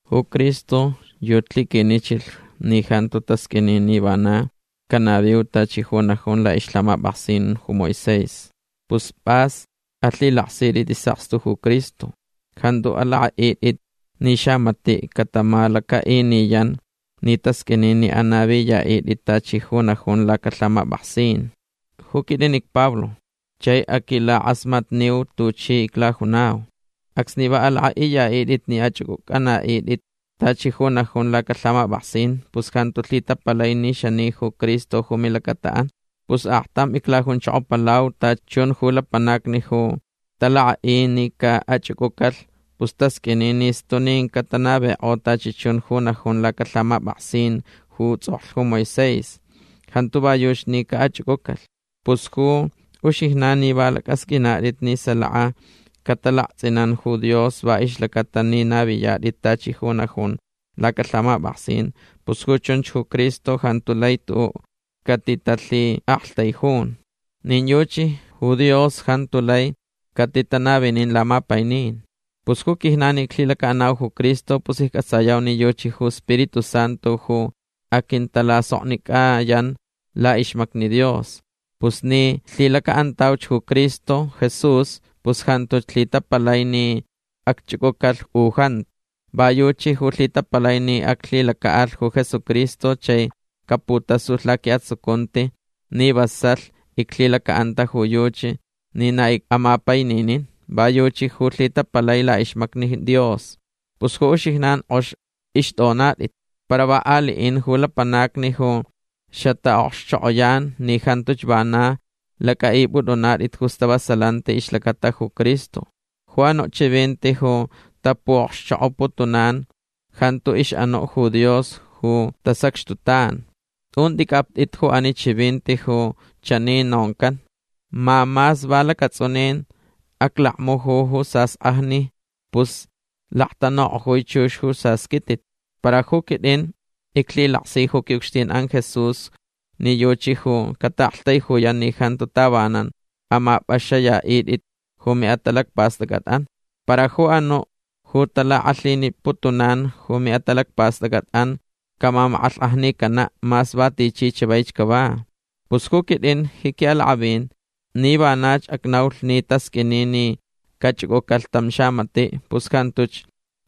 Ju Cristo yuchi lhiquinichilh ni jantu tasq'uini ni vana canaviu tachi ju najun la'ixlhamap'aksin ju Moisés. Pus p'as alhilaksit'it is'akstu ju Cristo. Jantu alak'a'it'it ni xamati' catamalaca'iniyan ni tasq'uini ni anaviya'it'it tachi ju najun lacalhamap'aksin. Ju quit'in icPablo chai aquilak'asmatniu tuchi iclajunau. Acsni va alak'a'iya'it'it ni ach'uc'uc'ana'it'it tachi ju najun lacalhamap'aksin pus jantu lhitapalai ni xani ju Cristo ju milacata'an. Pus aktam iclajunchokopalau. Tachi chun ju lapanacni ju talak'a'i ni ca'ach'uc'ucalh pus tasq'uini ni stunin catanavik'o tachi chun ju najun lacalhamap'aksin ju ts'oklh ju Moisés. Jantu va yuchi ni ca'ach'uc'ucalh. Pus ju uxijnan ni va lac'asq'uinat'it ni salaka catalakts'inan ju Dios va ixlaca'atalh ni naviyat'it tachi ju najun lacalhamap'aksin pus ju chunch ju Cristo jantu lai tu'u' catitalha'aktaijun. Nin yuchi ju Dios jantu lai catitanavinin lamapainin. Pus ju quijnan ni iclhilaca'anau ju Cristo pus icc'atsayau ni yuchi ju Spiritu Santu ju aquintalasoknic'ayan la'ixmacni Dios. Pus ni lhilaca'antauch ju Cristo Jesús pus jantuch lhitapalai ni acch'uc'ucalh u jantu. Va yuchi ju lhitapalai ni aclhilaca'alh ju Jesucristo chai caputasulh laqui'atsucunti ni vasalh iclhilaca'anta ju yuchi ni na ic'amapaininin. Va yuchi ju lhitapalai la'ixmacni Dios. Pus ju uxijnan k'ox ixt'onat'it. Para va alin ju lapanacni ju xata'okxchok'oyan ni jantuch vana lac'a'ip'ut'unat'it ju stavasalanti ixlacata ju Cristo. Ju anu' chivinti ju tapu'okxchok'oputunan jantu ix'anu' ju Dios ju tasacxtutan. Tun t'ic'apt'it ju ani chivinti ju chani noncan: “Ma mas va lacats'unin aclakmuju ju sask'ajni pus laktanuk'ojui chux ju sasquitit”. Para ju quit'in iclhilaksi ju qui'ucxtin'an Jesús ni yuchi ju cata'aktaijuyan ni jantu tavanan amap'axaniya'it'it ju mi'atalacpast'ac'at'an. Para ju anu' ju talak'alhiniputunan ju mi'atalacpast'ac'at'an camamak'alhk'ajnicana' mas va tichi chavaich cava. Pus ju quit'in ji qui'alak'avin ni vanach acnaulh ni tasq'uini ni cach'uc'ucalh tam xamati' pus jantuch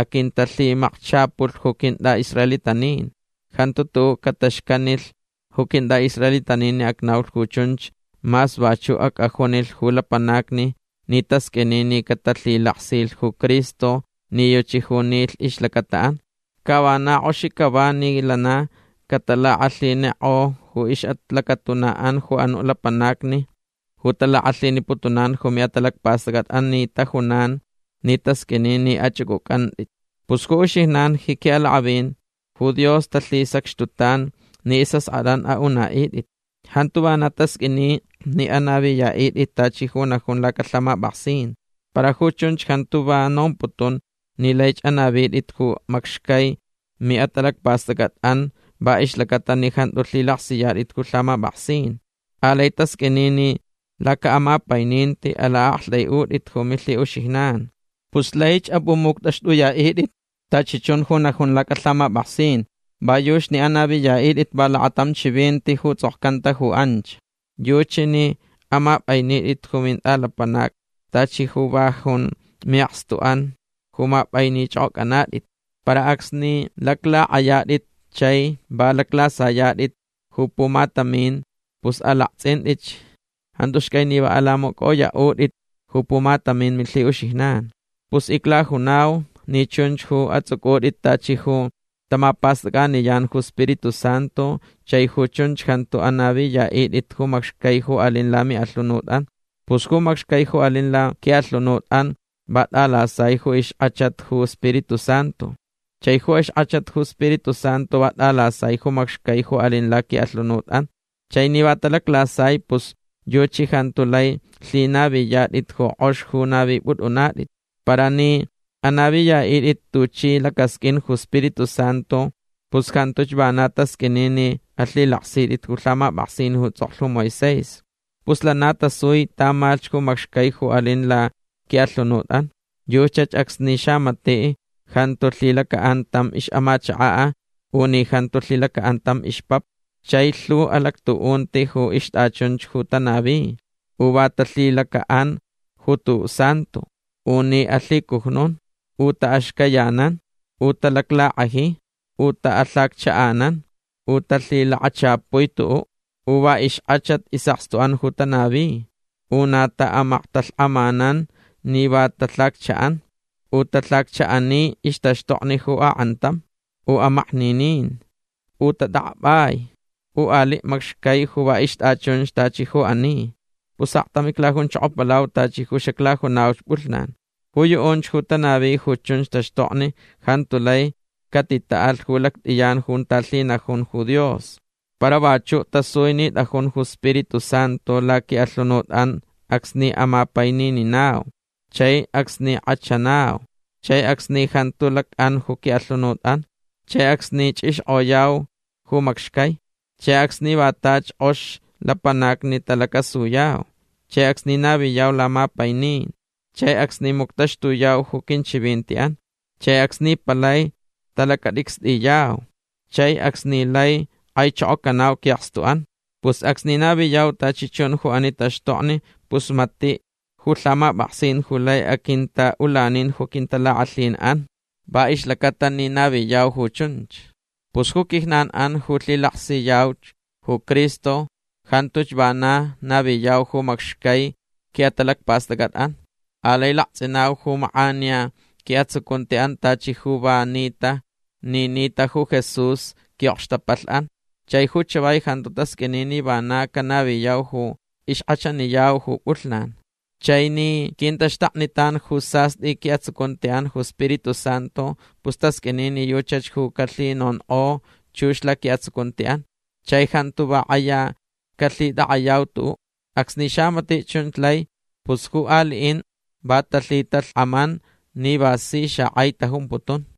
aquintalhimakchapulh ju quint'a'israelitanin. Jantu tu'u' cataxcanilh ju quint'a'israelitanin ni acnaulh ju chunch mas vachu' ac'ajunilh ju lapanacni ni tasq'uini ni catalhilaksilh ju Cristo ni yuchi ju nilh ixlacata'an. Ca vak tachi k'ox cava ni lana catalak'alhinik'o ju ixlacatuna'an ju anu' lapanacni ju talak'alhiniputunan ju mi'atalacpast'ac'at'an ni tajunan ni tasq'uini ni ach'uc'uc'anat'it. Pus ju uxijnan ji qui'alak'avin ju Dios talhisacxtutan ni is'ask'at'an a'una'it'it. Jantu vana tasq'uini ni anaviya'it'it tachi ju najun lacalhamap'aksin. Para ju chunch jantu va nomputun ni laich anavit'it ju macxcai mi'atalacpast'ac'at'an va ixlaca'atalh ni jantu lhilaksiyat'it ju lhamap'aksin. Alai tasq'uini ni laca'amapaininti ala'akt'ai'ut'it ju milhi'uxijnan. Pus laich ap'umuct'axt'uya'it'it tachi chun ju najun lacalhamap'aksin va yuchi ni anaviya'it'it va lakatam chivinti ju ts'okcanta ju anch. Yuchi ni amap'ainit'it ju mint'alapanac tachi ju va jun mi'akstuch'an ju map'ainich'ok'oc'ant'it. Para acsni laclak'ayat'it chai va laclasayat'it ju pumatamin pus alakts'int'itch. Jantu xcai ni va alamacoyok'ot'it ju pumatamin milhi'uxijnan. Pus iclajunau ni chunch ju ats'uc'ut'it tachi ju tamapast'ac'aniyan ju Spiritu Santu chai ju chunch jantu anaviya'it'it ju macxcai ju alin lami'alhunut'an. Pus ju macxcai ju alin laqui'alhunut'an va t'alasai ju ixk'achat ju Spiritu Santu. Chai ju ixk'achat ju Spiritu Santu va t'alasai ju macxcai ju alin laqui'alhunut'an. Chai ni va talaclasai pus yuchi jantu lai lhinaviyat'it ju k'ox ju navip'ut'unat'it. Para ni anaviya'it'it tuchi lacasq'uin ju Spiritu Santu pus jantuch vana tasq'uini ni alhilaksit'it ju lhamap'aksin ju ts'oklh ju Moisés. Pus lana tasui tamalh ju macxcai ju alin laqui'alhunut'an. Yuchach acsni xamati' jantu lhilaca'an tam ix'amachaka' u ni jantu lhilaca'an tam ixpapa. Chai lhu alactu'unti ju ixt'achun ju tanavi. U va talhilaca'an ju tu'u' santo. U ni alhicujnun. U ta'axcayanan. U talaclak'aji. U ta'alhaccha'anan. U talhilakachapui tu'u'. U va ixk'achat is'akstu'an ju tanavi. U na ta'amaktalhk'amanan ni va talhaccha'an. U talhaccha'ani ixtaxtokni ju ak'antam. U amakninin. U tat'ak'ap'ai. U ali' macxcai ju va ixt'achunch tachi ju ani. Pus aktam iclajunchokopalau tachi ju xaclajunauch p'ulhnan. Ju yu'unch ju tanavi ju chunch taxtokni jantu lai catita'alh ju lact'iyan junta lhinajun ju Dios. Para vachu' tasui ni t'ajun ju Spiritu Santu laqui'alhunut'an acsni amapainininau. Chai acsni k'achanau. Chai acsni jantu lac'an ju qui'alhunut'an. Chai acsni ch'ixk'oyau ju macxcai. Chai acsni va tachi k'ox lapanacni talacasuyau. Chai acsni naviyau lamapainin. Chai acsni muctaxtuyau ju quinchivinti'an. Chai acsni palai talacat'icst'iyau. Chai acsni lai k'aichokocanau qui'akstu'an. Pus acsni naviyau tachi chun ju ani taxtokni pus mati' ju lhamap'aksin ju lai aquinta'ulanin ju quintalak'alhin'an va ixlaca'atalh ni naviyau ju chunch. Pus ju quijnan'an ju lhilaksiyauch ju Cristo jantuch vana naviyau ju macxcai qui'atalacpast'ac'at'an. Alai lakts'inau ju mak'aniya qui'atsucunti'an tachi ju va nita ni nita ju Jesús qui'okxtapalh'an. Chai ju chavai jantu tasq'uini ni vana canaviyau ju ixk'achaniyau ju p'ulhnan. Chai ni quintaxtaknitan ju sast'i qui'atsucunti'an ju Spiritu Santu pus tasq'uini ni yuchach ju calhinonk'o chux laqui'atsucunti'an. Chai jantu va k'aya calhitak'ayau tu'u'. Acsni xamati' chunch lai pus ju ali'in va talhitalhk'aman ni va si xak'ai tajumputun.